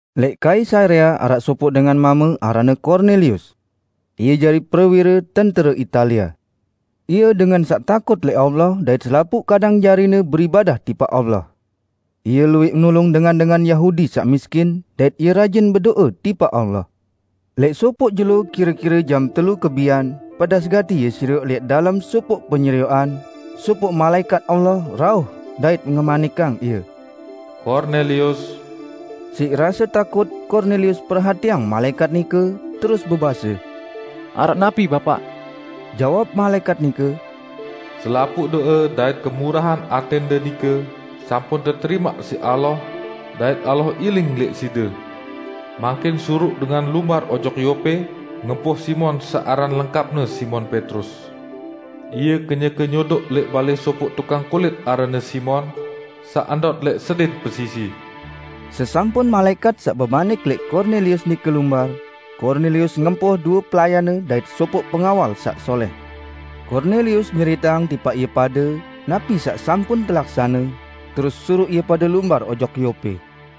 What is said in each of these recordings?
Lẽq Kaisarea araq sopoq dengan mame aranne Kornelius. Ie jari prewire "Tentere Italia." Ie dengan saq takut lẽq Allah dait selapuq kadang jarine beribadah tipaq Allah. Ie luwẽq nulung dengan-dengan Yahudi saq miskin, dait ie rajin bedo'e tipaq Allah. Lẽq sopoq jelo kire-kire jam telu kebian, pedas gati ie serioq lẽq dalem sopoq penyerioqan, sopoq malaẽkat Allah rauh dait ngemanikang ie, "Kornelius!" Siq rase takut Kornelius perhatiang malaẽkat nike terus bebase, "Araq napi Bapaq?" Jawab malaẽkat nike, "Selapuq do'e dait kemurahan atẽnde nike sampun teterimaq siq Allah dait Allah iling lẽq side. Mangkin suruq dengan lumbar ojok Yope ngempoh Simon saq aran lengkapne Simon Petrus. Ie kenyeke nyodoq lẽq balẽ sopoq tukang kulit aranne Simon, saq ndot lẽq sedin pesisi." Sesampun malaẽkat saq bemanik lẽq Kornelius nike lumbar, Kornelius ngempoh due pelayanne dait sopoq pengawal saq solẽh. Kornelius nyeriteang tipaq ie pade napi saq sampun telaksane, terus suruq ie pade lumbar ojok Yope.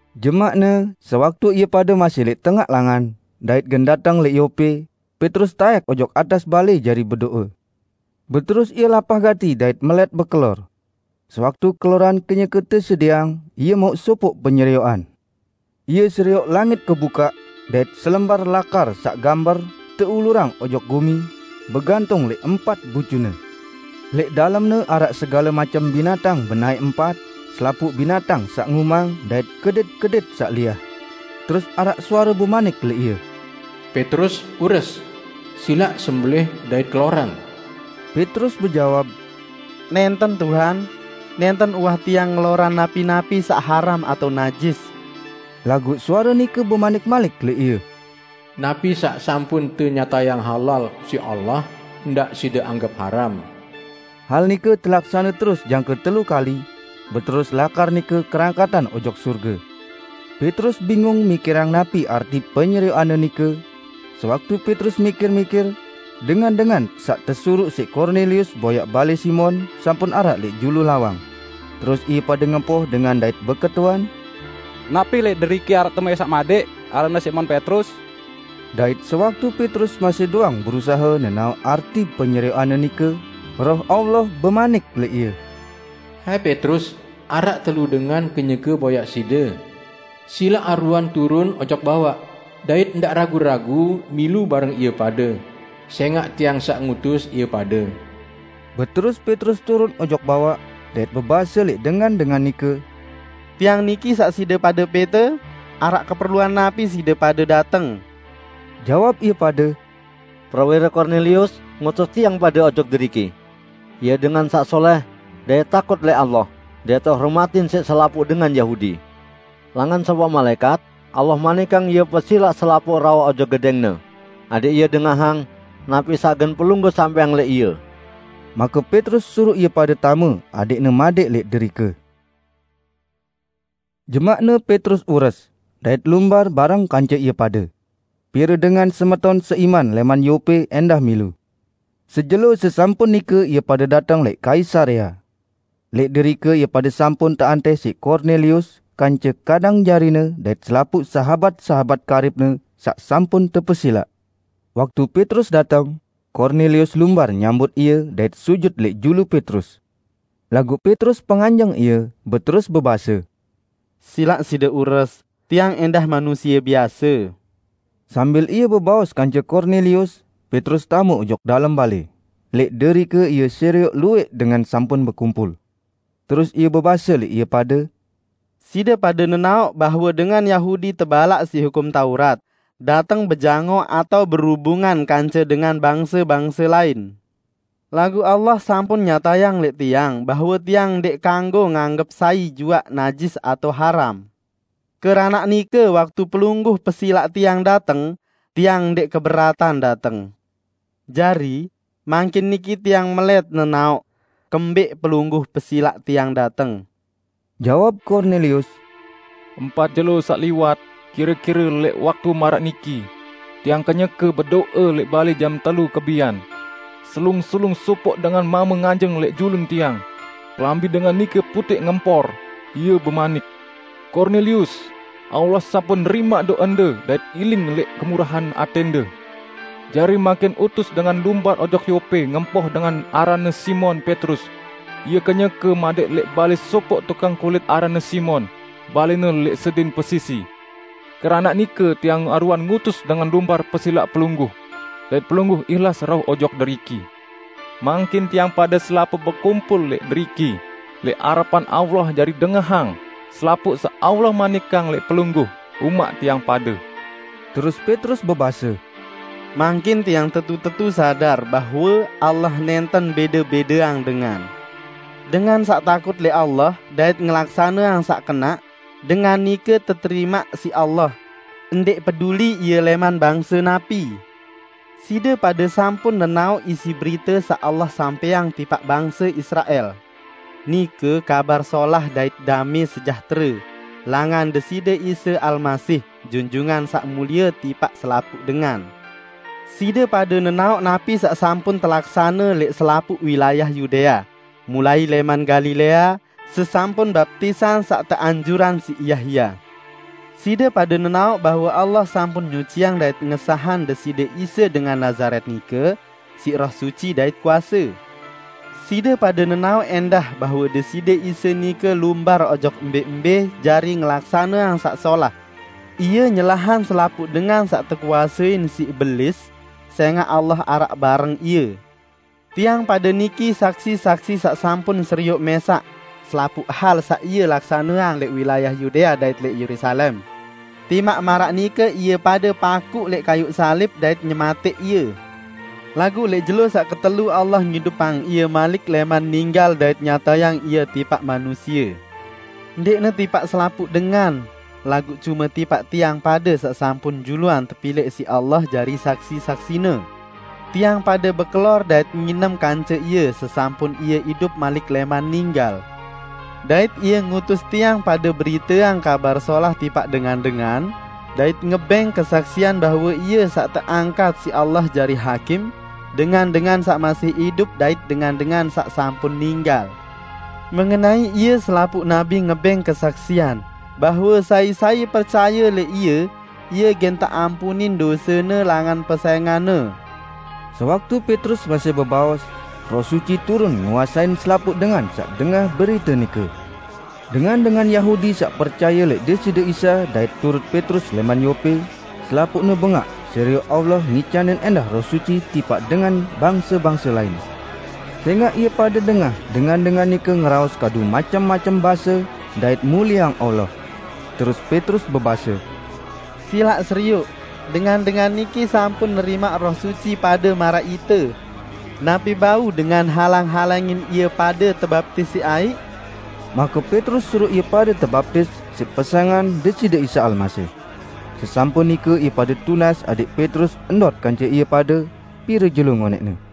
Jemaqne, sewaktu ie pade masih lẽq tengaq langan, dait gen dateng lẽq Yope, Petrus taẽk ojok atas balẽ jari bedo'e. Beterus ie lapah gati dait melẽt bekelor. Sewaktu keloran kenyeke tesedieang, ie mauq sopoq penyerioqan. Ie serioq langit kebukaq, dait selembar lakar saq gamber teulurang ojok gumi, begantung lẽq empat bucune. Lẽq dalemne araq segale macem binatang benaẽ empat, selapuq binatang saq ngumang dait kedit-kedit saq liah. Terus araq suare bemanik lẽq ie, "Petrus, ures! Silaq sembelẽh dait kelorang!" Petrus bejawab, "Nẽnten, Tuhan! Nẽnten uwah tiang ngelorang napi-napi saq haram atao najis." Laguq suare nike bemanik malik lẽq ie, "Napi saq sampun tenyatayang halal siq Allah, ndaq side anggep haram!" Hal nike telaksane terus jangke telu kali, beterus lakar nike kerangkatan ojok sorge. Petrus bingung mikirang napi arti penyerioqanne nike, sewaktu Petrus mikir-mikir, dengan-dengan saq tesuruq siq Kornelius boyaq balẽ Simon sampun araq lẽq julu lawang. Terus ie pade ngempoh dengan dait beketuan, "Napi lẽq deriki araq temuẽ saq madẽq, aranne Simon Petrus?" Dait sewaktu Petrus masih doang berusahe nenaoq arti penyerioqanne nike, Roh Allah bemanik lẽq ie, "Hai Petrus, araq telu dengan kenyeke boyaq side. Silaq aruan turun ojok bawaq, dait ndaq ragu-ragu milu bareng ie pade, sẽngaq Tiang saq ngutus ie pade." Beterus Petrus turun ojok bawaq, dait bebase lẽq dengan-dengan nike, "Tiang niki saq side pade pẽte, araq keperluan napi side pade dateng?" Jawab ie pade, "Prewire Kornelius ngutus tiang pade ojok deriki. Ie dengan saq solẽh dait takut lẽq Allah, dait tehormatin siq selapuq dengan Yahudi. Langan sopoq malaẽkat, Allah manikang ie pesilaq pelungguh rauh ojok gedẽngne, adẽq ie dengahang napi saq gen pelungguh sampẽang lẽq ie." Make Petrus suruq ie pade tame adẽqne madẽq lẽq derike. Jemaqne Petrus ures, dait lumbar bareng kance ie pade. Pire dengan semeton seiman lẽman Yope ẽndah milu. Sejelo sesampun nike ie pade dateng lẽq Kaisarea. Lẽq derike ie pade sampun teantih siq Kornelius kance kadang jarine dait selapuq sahabat-sahabat karibne saq sampun tepesilaq. Waktu Petrus dateng, Kornelius lumbar nyambut ie dait sujut lẽq julu Petrus. Laguq Petrus penganjeng ie, beterus bebase, "Silaq side ures, tiang ẽndah manusie biase." Sambil ie bebaos kance Kornelius, Petrus tame ojok dalem balẽ. Lẽq derike ie serioq luwẽq dengan sampun bekumpul. Terus ie bebase lẽq ie pade, "Side pade nenaoq bahwe dengan Yahudi tebalaq siq Hukum Taurat dateng bejangoq atao berubungan kance dengan bangse-bangse lain. Laguq Allah sampun nyatayang lẽq tiang bahwe tiang ndẽq kanggo nganggep sai juaq najis atao haram. Keranaq nike waktu pelungguh pesilaq tiang dateng, tiang ndẽq keberatan dateng. Jari, mangkin niki tiang melẽt nenaoq, kembẽq pelungguh pesilaq tiang dateng." Jawab Kornelius, "Empat jelo saq liwat, kire-kire lẽq waktu maraq niki, tiang kenyeke bedo'e lẽq balẽ jam telu kebian. Selung-selung sopoq dengan mame nganjeng lẽq julun tiang. Kelambi dengan nike putẽq ngempor. Ie bemanik, 'Kornelius, Allah sampun nerimaq do'ende dait iling lẽq kemurahan atẽnde. Jari mangkin utus dengan lumbar ojok Yope ngempoh dengan aranne Simon Petrus, ie kenyeke madẽq lẽq balẽ sopoq tukang kulit aranne Simon; balẽne lẽq sedin pesisi.' Keranaq nike tiang aruan ngutus dengan lumbar pesilaq pelungguh. Dait pelungguh ihlas rauh ojok deriki. Mangkin tiang pade selapuq bekumpul lẽq deriki lẽq arepan Allah jari dengahang selapuq saq Allah manikang lẽq pelungguh umaq tiang pade." Terus Petrus bebase, "Mangkin tiang tetu-tetu sadar bahwe Allah nẽnten bẽde-bẽdeang dengan. Dengan saq takut lẽq Allah dait ngelaksaneang saq kenaq, dengan nike teterimaq siq Allah, ndẽq peduli ie lẽman bangse napi. Side pade sampun nenaoq isi berite saq Allah sampẽang tipaq bangse Israel. Nike Kabar Solah dait damẽ sejahtere langan Deside Isa Almasih, Junjungan Saq Mulie tipaq selapuq dengan. Side pade nenaoq napi saq sampun telaksane lẽq selapuq wilayah Yudea, mulai lẽman Galilea, sesampun baptisan saq teanjurang siq Yahya. Side pade nenaoq bahwe Allah sampun nyuciang dait ngesahang Deside Isa dengan Nazaret nike siq Roh Suci dait kuase. Side pade nenaoq ẽndah bahwe Deside Isa nike lumbar ojok mbẽ-mbẽ jari ngelaksaneang saq solah; Ie nyelahang selapuq dengan saq tekuasein siq Belis, sẽngaq Allah araq bareng Ie. Tiang pade niki saksi-saksi saq sampun serioq mẽsaq selapuq hal saq Ie laksaneang lẽq wilayah Yudea dait lẽq Yerusalem. Timaq maraq nike ie pade pakuq lẽq kayuq salib dait nyematẽq Ie. Laguq lẽq jelo saq ketelu Allah ngidupang Ie malik lẽman ninggal dait nyatayang Ie tipaq manusie; ndẽqne tipaq selapuq dengan, laguq cume tipaq tiang pade saq sampun juluan tepilẽq siq Allah jari saksi-saksi-Ne: Tiang pade bekelor dait nginem kance Ie sesampun Ie idup malik lẽman ninggal. Dait Ie ngutus tiang pade beriteang Kabar Solah tipaq dengan-dengan dait ngebẽng kesaksian bahwe Ie saq teangkat siq Allah jari Hakim dengan-dengan saq masih idup dait dengan-dengan saq sampun ninggal. Mengenai Ie selapuq nabi ngebẽng kesaksian, bahwe sai-sai percaye lẽq Ie, ie gen teampunin dosene langan pesẽngan-Ne." Sewaktu Petrus masih bebaos, Roh Suci turun nguasein selapuq dengan saq dengah berite nike. Dengan-dengan Yahudi saq percaye lẽq Deside Isa dait turut Petrus lẽman Yope, selapuqne bengaq serioq Allah ngicanin ẽndah Roh Suci tipaq dengan bangse-bangse lain. Sẽngaq ie pade dengah dengan-dengan nike ngeraos kadu macem-macem base dait mulieang Allah. Terus Petrus bebase, "Silaq serioq, dengan-dengan niki sampun nerimaq Roh Suci pade maraq ite. Napi bau dengan halang-halangin ie pade tebaptis siq aiq?" Make Petrus suruq ie pade tebaptis siq pesẽngan Deside Isa Almasih. Sesampun nike ie pade tunas adẽq Petrus ndot kance ie pade pire jelo ngonẽqne.